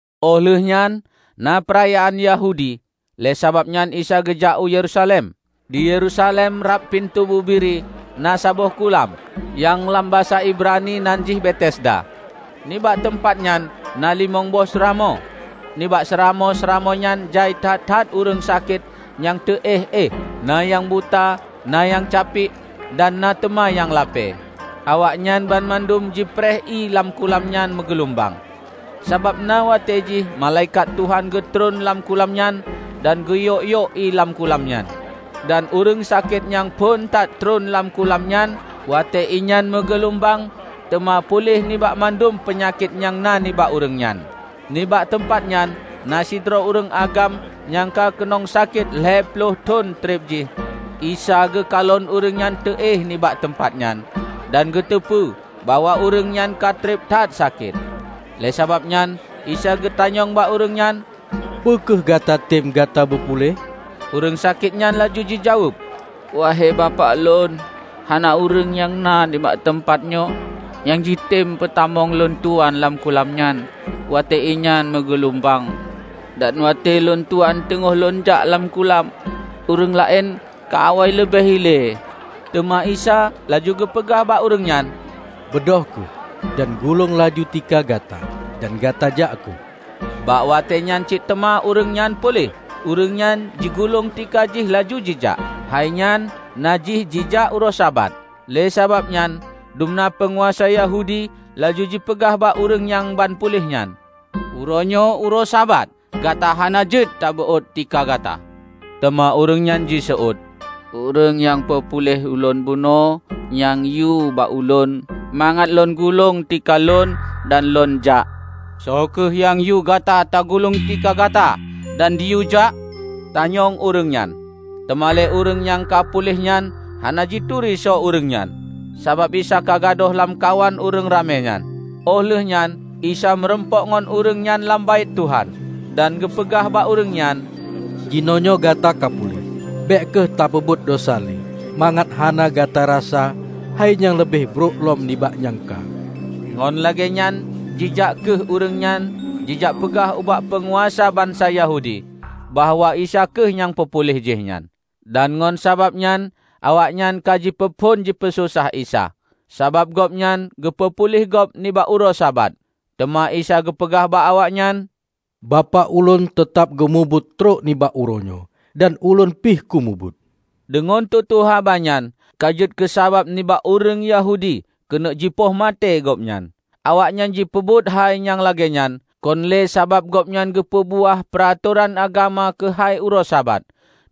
Óh lheueh nyan na peurayaan Yahudi, lé sabab nyan Isa geujak u Yerusalem. Di Yerusalem rab "Pintoe Bubiri" na saboh kulam, nyang lam basa Ibrani nan jih Betesda. Nibak teumpat nyan na limong boh seuramoe. Nibak seuramoe-seuramoe nyan jai that-that ureuëng sakét nyang teu-éh-éh; na nyang buta, na nyang capiek, dan na teuma nyang lapée. Awaknyan banmandum jipreh ié lam kulam nyan meugeulumbang. Sabab na watée jih malaikat Tuhan geutreun lam kulam nyan dan geuyok-yok ié lam kulam nyan. Dan ureuëng sakét nyang phon that treun lam kulam nyan watée ié nyan meugeulumbang teuma puléh nibak mandum peunyakét nyang na nibak ureuëng nyan. Nibak teumpat nyan na sidroe ureuëng agam nyang ka keunong sakét lhée ploh lapan thon treb jih. Isa geukalon ureuëng nyan teu-éh nibak teumpat nyan, dan geuteupeue bahwa ureuëng nyan ka treb that sakét; lé sabab nyan Isa geutanyong bak ureuëng nyan, "Peu kheueh gatatem gata beu puléh?" Ureuëng sakét nyan laju jijaweueb, "Wahe Bapak lôn, hana ureuëng nyang na nibak teumpat nyoe nyang jitem peutamong lôntuan lam kulam nyan watée ié nyan meugeulumbang. Dan watée lôntuan teungoh lôn jak lam kulam, ureuëng laén ka awai leubeh ilée." Teuma Isa laju geupeugah bak ureuëng nyan, "Beudôh kheueh, dan gulong laju tika gata dan gata jak kheueh." Bak watée nyan cit teuma ureuëng nyan puléh. Ureuëng nyan jigulong tika jih laju jijak. Hainyan na jih jijak uroe Sabat. Lé sababnyan dumna peunguasa Yahudi laju jipeugah bak ureuëng nyang ban puléh nyan, "Uroenyoe uroe Sabat. Gata hana jeuet tabeuôt tika gata." Teuma ureuëng nyan jiseuôt, "Ureuëng nyang peupuléh ulôn bunoe nyang yue bak ulôn mangat lôn gulong tika lôn dan lôn jak." "Soe kheueh nyang yue gata tagulong tika gata dan jiyue jak?" tanyong ureuëng nyan. Teuma lé ureuëng nyang ka puléh nyan hana jituri soe ureuëng nyan, sabab Isa ka gadôh lamkawan ureuëng ramé nyan. Óh lheuehnyan Isa meurumpok ngon ureuëng nyan lam Baét Tuhan, dan geupeugah bak ureuëng nyan, "Jinoenyoe gata ka puléh. Bék kheueh tapeubuet desya lé, mangat hana gata rasa hai nyang leubeh brok lom nibak nyang ka." Ngon lagéenyan jijak kheueh ureuëng nyan jijak peugah ubak peunguasa bansa Yahudi bahwa Isa kheueh nyang peupuléh jihnyan. Dan ngon sabab nyan awaknyan ka jipeuphon jipeusosah Isa, sabab gobnyan geupeu puléh gob nibak uroe Sabat. Teuma Isa geupeugah bak awaknyan, "Bapak ulôn teutab geumubuet trok nibak uroenyoe, dan Ulôn pih kumubuet." Deungon tutoe haba nyan ka jeuet keusabab nibak ureuëng Yahudi keuneuk jipoh maté Gobnyan. Awaknyan jipeubuet hai nyang lagée nyan, kon lé sabab Gobnyan geupeu beuáh peuratoran agama keuhai uroe Sabat,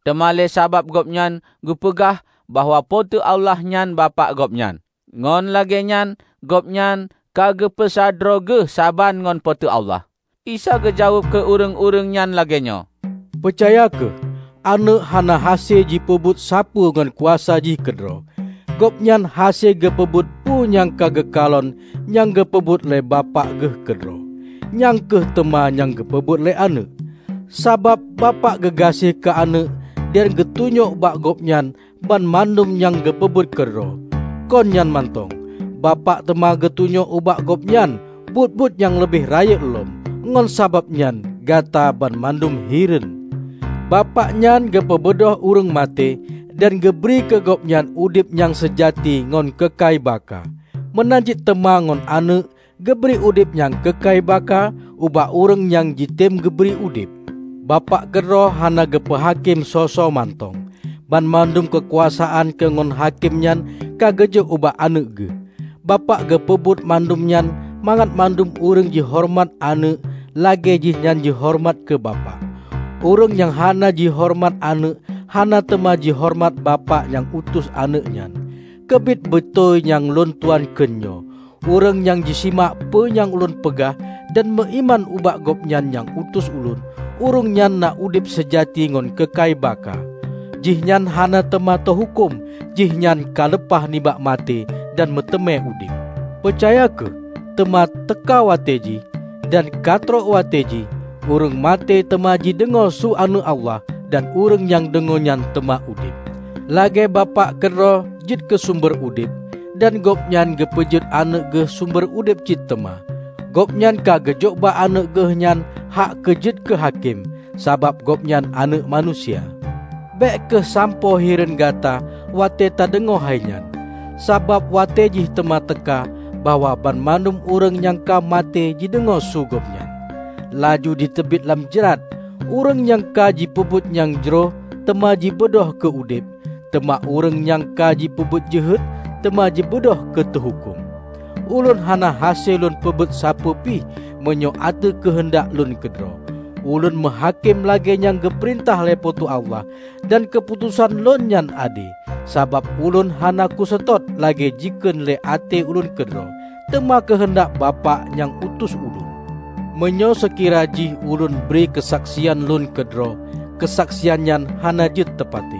teuma lé sabab Gobnyan geupeugah bahwa Po teu Allah nyan Bapak Gobnyan; ngon lagée nyan Gobnyan ka geupeusa droe Geuh saban ngon Po teu Allah. Isa geujaweueb keu ureuëng-ureuëng nyan lagée nyoe, "Peucaya kheueh, Aneuëk hana hase jipeubuet sapeue ngon kuasa jih keudroe. Gobnyan hase geupeubuet peue nyang ka geukalon nyang geupeubuet lé Bapak Geuh keudroe, nyang kheueh teuma nyang geupeubuet lé Aneuëk. Sabab Bapak geugaséh keu Aneuëk dan geutunyok bak Gobnyan banmandum nyang geupeubuet keudroe. Kon nyan mantong, Bapak teuma geutunyok ubak Gobnyan buet-buet nyang leubeh rayeuk lom, ngon sababnyan gata banmandum hireuen. Bapak nyan geupeubeudôh ureuëng maté, dan geubri keu gobnyan udeb nyang seujati ngon keukai baka; meunan cit teuma ngon Aneuëk geubri udeb nyang keukai baka ubak ureuëng nyang jitem geubri udeb. Bapak keudroe hana geupeu hakém soe-soe mantong. Banmandum keukuasaan keu ngon hakém nyan ka geujok ubak Aneuëk Geuh. Bapak geupeubuet mandum nyan mangat mandum ureuëng jihoreumat Aneuëk lagée jihnyan jihoreumat keu Bapak. Ureuëng nyang hana jihoreumat Aneuëk hana teuma jihoreumat Bapak nyang utus Aneuëk nyan. Keubiet beutôi nyang lôntuan kheun nyoe: Ureuëng nyang jisimak peue nyang Ulôn peugah, dan meuiman ubak Gobnyan nyang utus Ulôn, ureuëng nyan na udeb seujati ngon keukai baka. Jihnyan hana teuma teuhuköm; jihnyan ka leupah nibak maté dan meuteumé udeb. Peucaya kheueh: Teuma teuka watée jih -- dan ka trok watée jih -- ureuëng maté teuma jideungoe su Aneuëk Allah. Dan ureuëng nyang deungoe nyan teuma udeb. Lagée Bapak keudroe jeuet keu sumber udeb, dan Gobnyan geupeujeuet Aneuëk Geuh sumber udeb cit teuma. Gobnyan ka geujok bak Aneuëk Geuh nyan hak keujeuet keu hakém, sabab Gobnyan Aneuëk Manusia. Bék kheueh sampoe hireuen gata watée tadeungoe hai nyan, sabab watée jih teuma teuka bahwa banmandum ureuëng nyang ka maté jideungoe su Gobnyan, laju jiteubiet lam jrat. Ureuëng nyang ka jipeubuet nyang jroh teuma jibeudôh keu udeb. Teuma ureuëng nyang ka jipeubuet jeuhet teuma jibeudôh keu teuhuköm." "Ulôn hana hase lôn peubuet sapeue pih meunyoe ateueh keuheundak lôn keudroe. Ulôn meuhakém lagée nyang geupeurintah lé Po teu Allah. Dan keuputosan Lôn nyan ade, sabab Ulôn hana kuseutôt lagée jikheun lé até Lôn keudroe, teuma keuheundak Bapak nyang utus Ulôn. Meunyoe seukira jih ulôn bri keusaksian Lôn keudroe, keusaksian nyan hana jeuet teupatéh.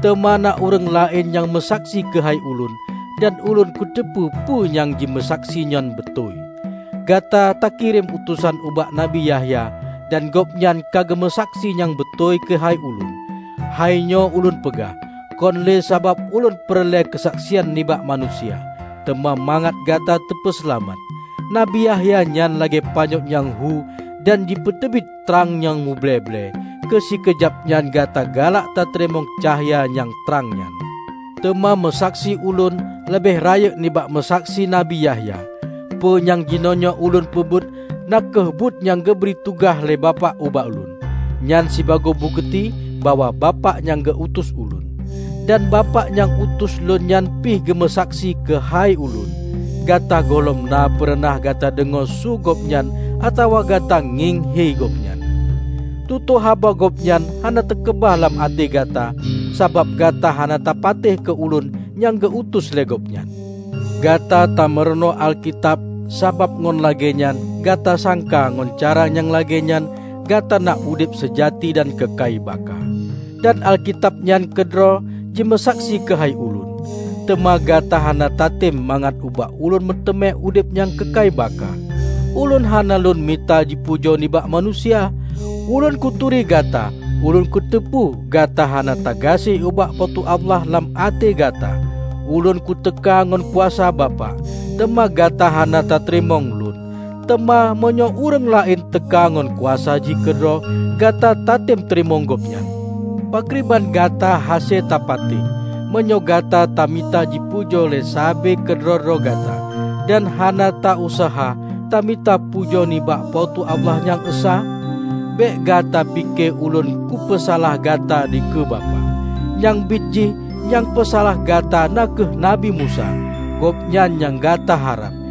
Teuma na ureuëng laén nyang meusaksi keuhai Ulôn, dan Ulôn kuteupeue peue nyang jimeusaksi nyan beutôi. Gata ka takirém utosan ubak Nabi Yahya, dan gobnyan ka geumeusaksi nyang beutôi keuhai Ulôn. Hai nyoe Ulôn peugah, kon lé sabab Ulôn peureulée keusaksian nibak manusia, teuma mangat gata teupeuseulamat. Nabi Yahya nyan lagée panyöt nyang hu dan jipeuteubiet trang nyang muble-ble. Keu sikeujab nyan gata galak tateurimong cahya nyang trang nyan. Teuma meusaksi Ulôn leubeh rayeuk nibak meusaksi Nabi Yahya, peue nyang jinoenyoe Ulôn peubuet, na kheueh buat nyang geubri tugaih lé Bapak ubak Ulôn, nyan sibagoe bukeuti bahwa Bapak nyang geu utus Ulôn. Dan Bapak nyang utus lôn nyan pih geumeusaksi keuhai Ulôn. Gata gohlom na peureunah gata deungoe su Gobnyan atawa gata ngieng hi Gobnyan. Tutoe haba Gobnyan hana teukeubah lam até gata sabab gata hana tapatéh keu Ulôn nyang geu-utus lé Gobnyan. Gata tameurunoe Alkitab sabab ngon lagée nyan gata sangka ngon cara nyang lagée nyan gata na udeb seujati dan keukai baka. Dan Alkitab nyan keudroe jimeusaksi keuhai Ulôn. Teuma gata hana tatem mangat ubak ulôn meuteumé udeb nyang keukai baka. Ulôn hana lôn mita jipujoe nibak manusia. Ulôn kuturi gata. Ulôn kuteupeue gata hana tagaséh ubak Po teu Allah lam até gata. Ulôn kuteuka ngon kuasa Bapak, teuma gata hana tateurimong Lôn. Teuma meunyoe ureuëng laén teuka ngon kuasa jih keudroe, gata tatem teurimong Gobnyan. Pakriban gata hase tapatéh, meunyoe gata tamita jipujoe lé sabe keudroe-droe gata, dan hana ta useuha tamita pujoe nibak Po teu Allah nyang Esa? Bék gata pike Ulôn kupeusalah gata dikeue Bapak. Nyang bit jih nyang peusalah gata na kheueh Nabi Musa, gobnyan nyang gata harab.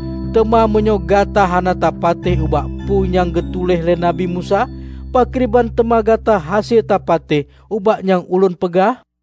Teuma meunyoe gata hana tapatéh ubak peue nyang geutuléh lé Nabi Musa, pakriban teuma gata hase tapatéh ubak nyang Ulôn peugah?"